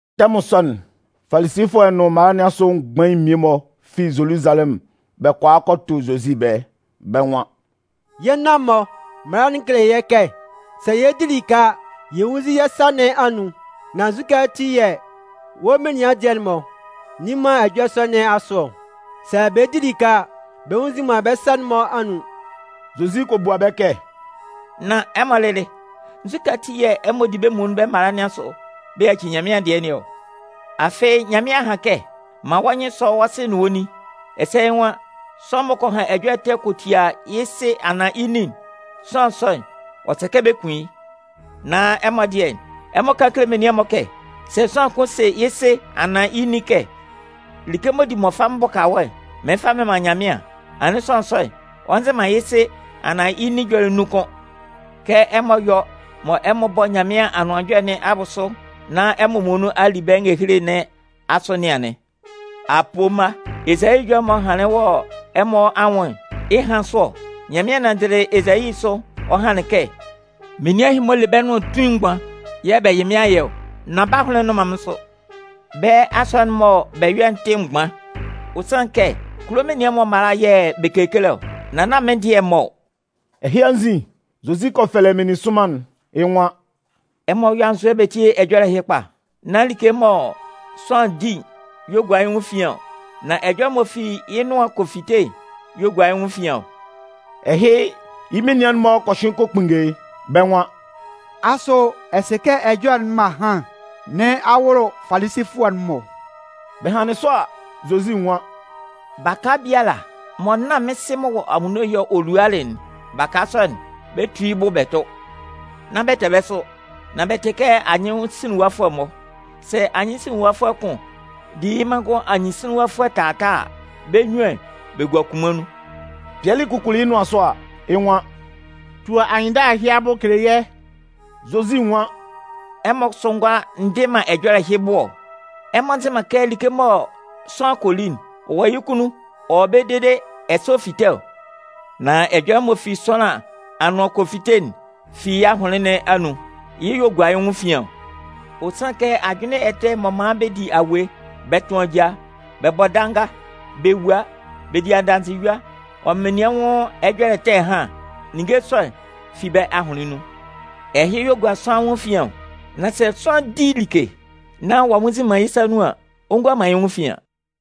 Tɛmʋn sɔ'n, Falisifʋɛ nʋn mala nɩn asʋ mgbain mmie-mɔ fi Zoluzalɛmʋn bɛ kɔ a kɔ tʋ Zozi ɛbɛlɛ, bɛ́ nwan: “Yɛ́ nan-mɔ mala'n kele yɛ́ kɛ sɛ yɛ 'di like a, yɛ nwúnnzin yɛ́ sa nɩn anun. Nan nzukɛ ati yɛ̂ wɔ́ menian dɩɛ'n-mɔ nni man ɛjɔlɛ sɔ nɩn asʋ ɔ? Sɛ bɛ 'di like a, bɛ nnwunnzin man bɛ́ sa'n-mɔ anun.” Zozi kɔ bua bɛ́ kɛ: “Nán ɛmɔ lɩlɩ, nzukɛ ati yɛ̂ ɛmɔ di bɛ́ muonun bɛ́ mala'n-mɔ asʋ bɛ yaci Nyanmɩan dɩɛ nɩn ɔ? Afɩ Nyanmɩan a han kɛ: Man wɔ́ nyɩn sɔ́ wɔ́ sɩ nʋn wɔ́ nin. Ɛsɛ yɩ́ nwan: Sʋanlan m'ɔ kɔ han ɛjɔlɛ ɛtɛ kɔ tia yɩ́ sɩ anaan yɩ́ nin'n, sʋanlan sɔ'n, ɔ sɛ kɛ bɛ kun yɩ́. Nan ɛmɔ dɩɛ, ɛmɔ kan kele menian'n-mɔ kɛ, sɛ sʋanlan kʋn se yɩ́ sɩ anaan yɩ́ nin kɛ: ‘Like'n m'ɔ di mɔ mɩn fa mɩn bʋka wɔ́'n, mɩɩn fa mɩn man Nyanmɩan’, anɩn sʋanlan sɔ'n, ɔ nzɩ man yɩ́ sɩ anaan yɩ́ nin ɛjɔlɛ nun kʋ́n. Kɛ ɛmɔ yɔ mɔ ɛmɔ bɔ Nyanmɩan Anʋan Ɛjɔlɛ nɩn abʋsʋ nán ɛmɔ muonun a li bɛ́ ngehele nɩn asʋ nɩn anɩn. Apoo mma, Ezayi ɛjɔlɛ'n m'ɔ hanlɩn wɔ ɛmɔ anwʋn'n, yɩ́ ɛhan sʋ ɔ. Nyanmɩan nanndɩlɩ Ezayi sʋ ɔ hanlɩn kɛ: Menian ɛhɩ-mɔ, bɛ le bɛ́ nʋan tuin mgban yɛ̂ bɛ yɩ mɩ́n ayɛ ɔ, nan bɛ́ ahʋnlɩn'n nnʋn man mɩ́n sʋ. Bɛ́ asɔnɩn'n mɔ bɛ yɔ'n tɩ mgban. Ɔ sanlɩn kɛ kulo menian mala yɛ̂ bɛ kekele ɔ, nan nán mɩ́n dɩɛ'n-mɔ ɔ.” Ɛhɩ anzin, Zozi kɔ fɛlɛ meninsʋnman'n, yɩ́ nwan: “Ɛmɔ yɔ́ anzʋɛ bɛ tíe ɛjɔlɛ ɛhɩ kpa. Nán like mɔ sʋanlan di'n y'ɔ gua yɩ́ nwʋn efian ɔ, nan ɛjɔlɛ m'ɔ fi yɩ́ nʋan kɔ fite'n y'ɔ gua yɩ́ nwʋn efian ɔ.” Ɛhɩ, yɩ́ menian'n-mɔ kɔ hyʋɩn kɔ kpunnge yɩ́, bɛ́ nwan: “Asʋ ɛ sɩ kɛ ɛjɔlɛ'n mɔ a han nɩn a wʋlʋ Falisifʋɛ'n-mɔ ɔ?” Bɛ hanlɩn sɔ a, Zozi nwan: “Baka biala mɔ nán mɩ́n Sɩ'n m'ɔ wɔ anwunno'n yɛ̂ ɔ lualɩ'n, baka sɔ'n, bɛ 'tu yɩ́ bɛ tʋ. Nán bɛ tɛ bɛ́ sʋ, nan bɛ tɩ kɛ anyɩnsinlinwafʋɛ-mɔ! Sɛ anyɩnsinlinwafʋɛ kʋn di yɩ́ manngʋn anyɩnsinlinwafʋɛ taataa a, bɛ́ munnyuan bɛ 'gua kunman nun.” Pɩɛlɩ kukuli yɩ́ nʋan sʋ a, yɩ́ nwan: “Tu anyɩnndala ɛhɩ abʋ kele yɛ́.” Zozi nwan: “Ɛmɔ kʋsʋ ngʋala ndɩ man ɛjɔlɛ bʋ ɔ? Ɛmɔ nzɩ man kɛ like mɔ sʋanlan kɔ li'n, ɔ kɔ yɩ́ kunnun, ɔ wɔ ɛbɛlɛ dede ɛsɛ ɔ fite ɔ? Nan ɛjɔlɛ m'ɔ fi sʋanlan anʋan kɔ fite'n fi yɩ́ ahʋnlɩn nɩn anun. Yɩ́ y'ɔ gua yɩ́ nwʋn efian ɔ. Ɔ sanlɩn kɛ ajʋnlɩn ɛtɛ m'ɔ man bɛ di awue, bɛ tʋn ajaa, bɛ bɔ danga, bɛ wua, bɛ di adanzɩyua ɔ nʋn menian anwʋn ɛjɔlɛ ɛtɛ ɛhan, ninnge sɔ'n fi bɛ́ ahʋnlɩn nun. Ɛhɩ y'ɔ gua sʋanlan anwʋn efian ɔ. Nan sɛ sʋanlan 'di like nan ɔ'a nnwunnzin man yɩ́ sa nun an, ɔ ngua man yɩ́ nwʋn efian.”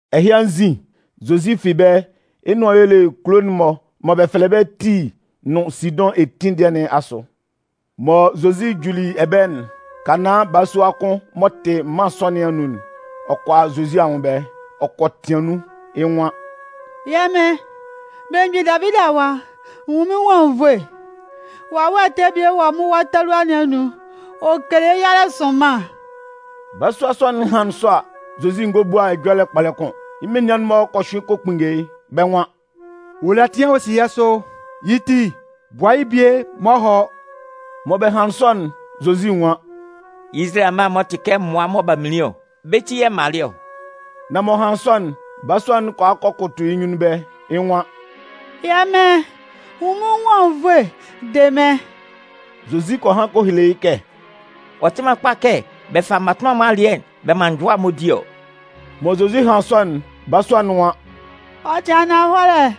Ɛhɩ anzin, Zozi fi ɛbɛlɛ yɩ́ nʋan y'ɔ le kulo'n-mɔ mɔ bɛ fɛlɛ bɛ́ Tii nʋn Sidʋn etin dɩɛ nɩn asʋ. Mɔ Zozi juli ɛbɛlɛ'n, Kanaân balasua kʋn m'ɔ tɩ mân sɔ nɩn anun'n, ɔ kɔ a Zozi anwʋn ɛbɛlɛ, ɔ kɔ tɩan nun. Yɩ́ nwan: “Yɛ́ Mɩn, belemgbin Davidi Awa, nwun mɩ́n nwʋn anwunnvoe! Wawɛ ɛtɛ bie wɔ mɩ́n wa talua nɩn anun. Ɔ kele yɩ́ yalɛ sʋnman.” Balasua sɔ'n hanlɩn sɔ a, Zozi ngɔ bua man ɛjɔlɛ kpɔlɛ kʋ́n. Yɩ́ menian'n-mɔ kɔ hyʋɩn kɔ kpunnge yɩ́, bɛ́ nwan: “Ɔ le ɛtɩan ɔ si yɛ́ sʋ. Yɩ́ ti, bua yɩ́ bie maan ɔ hɔ́.” Mɔ bɛ hanlɩn sɔ'n, Zozi nwan: “Izalayɛ amma'n-mɔ mɔ bɛ tɩ kɛ mmʋa mɔ b'a minlin'n, bɛ́ ti yɛ̂ m malɩ ɔ.” Nan m'ɔ hanlɩn sɔ'n, balasua'n kɔ a kɔ kʋtʋ yɩ́ nyunnun ɛbɛlɛ, yɩ́ nwan: “Yɛ́ Mɩn, nwun mɩ́n nwʋn anwunnvoe, de mɩ́n!” Zozi kɔ han kɔ hele yɩ́ kɛ: “Ɔ tɩ man kpa kɛ bɛ fa mmatʋnman'n-mɔ alɩɛ'n bɛ man njʋa mma'n-mɔ di ɔ.” Mɔ Zozi hanlɩn sɔ'n, balasua'n nwan: “Ɔ tɩ ananhɔlɛ,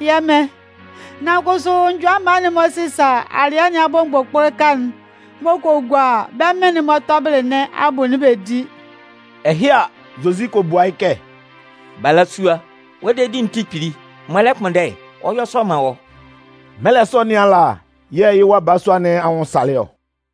yɛ́ Mɩn. Nan kʋsʋ njʋa mma'n-mɔ sɩsa alɩɛ nɩn abʋ mgbʋkpʋlʋka'n m'ɔ kɔ gua bɛ́ mɩ́n'n-mɔ tɔbɩlɩ nɩn abʋ'n bɛ di.” Ɛhɩ a, Zozi kɔ bua yɩ́ kɛ: “Balasua, wɔ́ dedi'n tɩ kpili! Mɔ ɛ lɛ kpʋnndɛ'n, ɔ yɔ́ sɔ man wɔ́.” Mɛlɛ sɔ nɩn ala, yɛ̂ yɩ wa balasua nɩn anwʋn salɩ ɔ.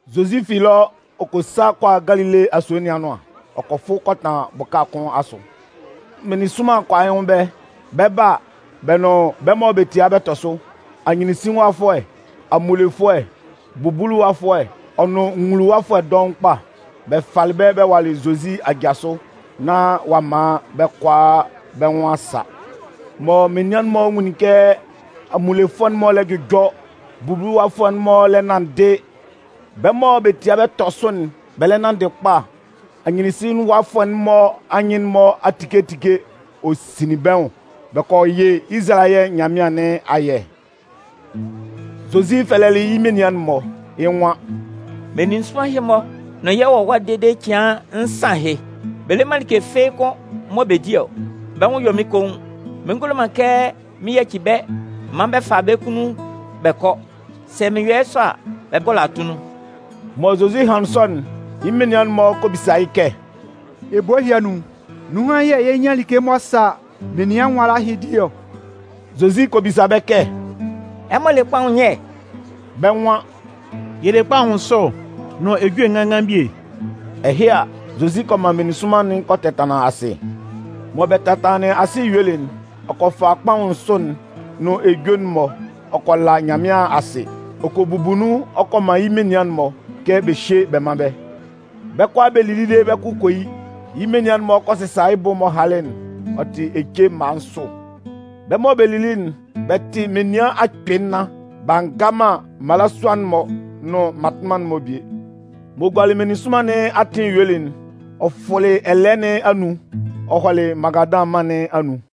Zozi fi ɛlɔ ɔ kɔ sa kɔ a Galile asue nɩn anʋan. Ɔ kɔ fʋ kɔ tanlan bʋka kʋn asʋ. Meninsʋnman kɔ a yɩ́ nwʋn ɛbɛlɛ. Bɛ 'ba a, bɛ nʋn bɛ́ mɔ bɛ tia bɛ tɔ sʋ, anyɩnsinlinwafʋɛ, amunlefʋɛ, bubuluwafʋɛ ɔ nʋn nwuluwafʋɛ dɔʋn kpa. Bɛ falɩ bɛ́ bɛ walɩ Zozi aja sʋ nán ɔ'a man bɛ́ kʋalaa bɛ́ nwʋn a sa. Mɔ menian'n-mɔ nwunlin kɛ amunlefʋɛ'n-mɔ lɛ jʋjɔ, bubuluwafʋɛ'n-mɔ lɛ nanndɩ, bɛ́ mɔ bɛ tia bɛ tɔ sʋ'n, bɛ lɛ nanndɩ kpa, anyɩnsinlinwafʋɛ'n-mɔ anyɩn'n-mɔ a tike tike'n, ɔ sinlin bɛ́ nwʋn, bɛ kɔ yɩ́ Izalayɛ Nyanmɩan nɩn ayɛ. Zozi fɛlɛlɩ yɩ́ menian'n-mɔ, yɩ́ nwan: “Meninsʋnman ɛhɩ-mɔ nʋn yɛ wɔ ɛwa yɩ́ cɩan nsan ahɩ. Bɛ le man like fɩ́ɩ́ kʋ́n mɔ bɛ di ɔ. Bɛ́ nwʋn yɔ mɩ́n koun. Mɩn ngulo man kɛ mɩn yaci bɛ́ m man bɛ fa bɛ́ kunnun bɛ kɔ. Sɛ mɩn yɔ yɩ́ sɔ a, bɛ 'gɔlɔ atunnun.” Mɔ Zozi hanlɩn sɔ'n, yɩ́ menian'n-mɔ kɔ bisa yɩ́ kɛ: “Ebo ɛhɩ anun, ninhan yɛ̂ yɛ 'nyan like m'ɔ sa menian nwala ɛhɩ di ɔ?” Zozi kɔ bisa bɛ́ kɛ: “Ɛmɔ le kpaʋn nyɛ?” Bɛ́ nwan: “Yɛ le kpaʋn nsʋ, nʋn ejue nganngan bie.” Ɛhɩ a, Zozi kɔ man meninsʋnman'n kɔ tɛtanlan asɩ. Mɔ bɛ tɛtanlanlɩn asɩ yuelɩ'n, ɔ kɔ fa kpaʋn nsʋ'n nʋn ejue'n-mɔ ɔ kɔ la Nyanmɩan asɩ. Ɔ kɔ bubu nun ɔ kɔ man yɩ́ menian'n-mɔ kɛ bɛ hyé bɛ mán bɛ́. Bɛ́ kʋalaa bɛ kɔ li dede bɛ́ kʋ kɔ yi. Yɩ́ menian'n-mɔ kɔ sɩsa yɩ́ bʋ'n m'ɔ halɩ'n, ɔ tɩ ece mma nsʋ. Bɛ́ mɔ bɛ lili'n, bɛ tɩ menian akpɩɩ nnan, b'a nga man mmalasua'n-mɔ nʋn mmatʋnman'n-mɔ bie. M'ɔ gualɩ meninsʋnman nɩn atɩn yuelɩ'n, ɔ fʋlɩ ɛlɛɛ nɩn anun, ɔ hɔlɩ Magadan mân nɩn anun.